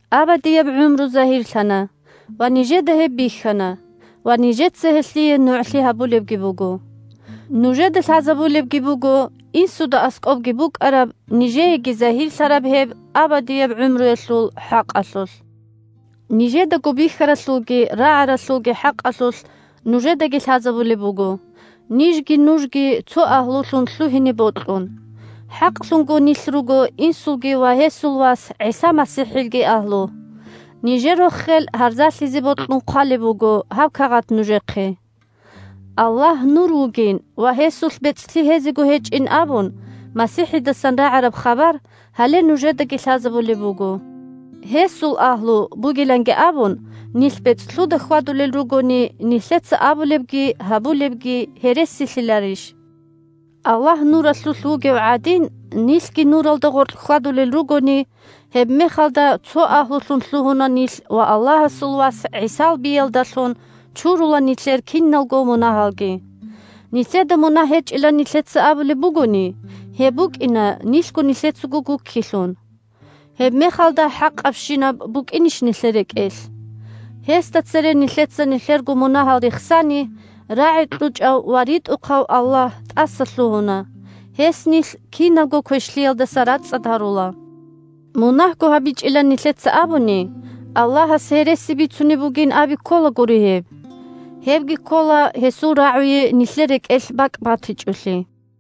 Абадияб гӀумру загьирлъана, ва нижеда гьеб бихьана, ва нижеца гьелъие нугӀлъи гьабулебги буго. Нужеда лъазабулебги буго Инсуда аскӀобги букӀараб, нижееги загьирлъараб гьеб абадияб гӀумруялъул хӀакъалъулъ. Нижедаго бихьаралъулги рагӀаралъулги хӀакъалъулъ нужедаги лъазабулеб буго, нижги нужги цо агьлулъун лъугьине бокьун. ХӀакълъунго нилъ руго Инсулги ва гьесул Вас ГӀиса МасихӀилги агьлу. Нижер рохел гьарзалъизе бокьун хъвалеб буго гьаб кагъат нужехъе. Аллагь Нур вугин ва гьесулъ бецӀлъи гьезего гьечӀин абун МасихӀидасан рагӀараб хабар гьале нужедаги лъазабулеб буго. Гьесул агьлу бугиланги абун нилъ бецӀлъуда хьвадулел ругони, нилъеца абулебги гьабулебги гьересилъиларищ? Аллагь Нуралъулъ вугев гӀадин, нилъги Нуралда гъоркь хьвадулел ругони, гьебмехалда цо агьлулъун лъугьуна нилъ ва Аллагьасул Вас ГӀисал биялдалъун чурула нилъер киналго мунагьалги. Нилъеда мунагь гьечӀилан нилъеца абулеб бугони, гьеб букӀина нилъго нилъецаго гуккилъун. Гьебмехалда хӀакъабщинаб букӀинищ нилъер рекӀелъ? Гьесда цере нилъеца нилъерго мунагьал рехсани, рагӀи кьучӀав ва ритӀухъав Аллагь тӀасалъугьуна, гьес нилъ кинабго квешлъиялдаса рацӀцӀад гьарула. Мунагьго гьабичӀилан нилъеца абуни, Аллагьас гьереси бицунеб бугин аби кколагури гьеб. Гьебги ккола гьесул РагӀуе нилъер рекӀелъ бакӀ батичӀолъи.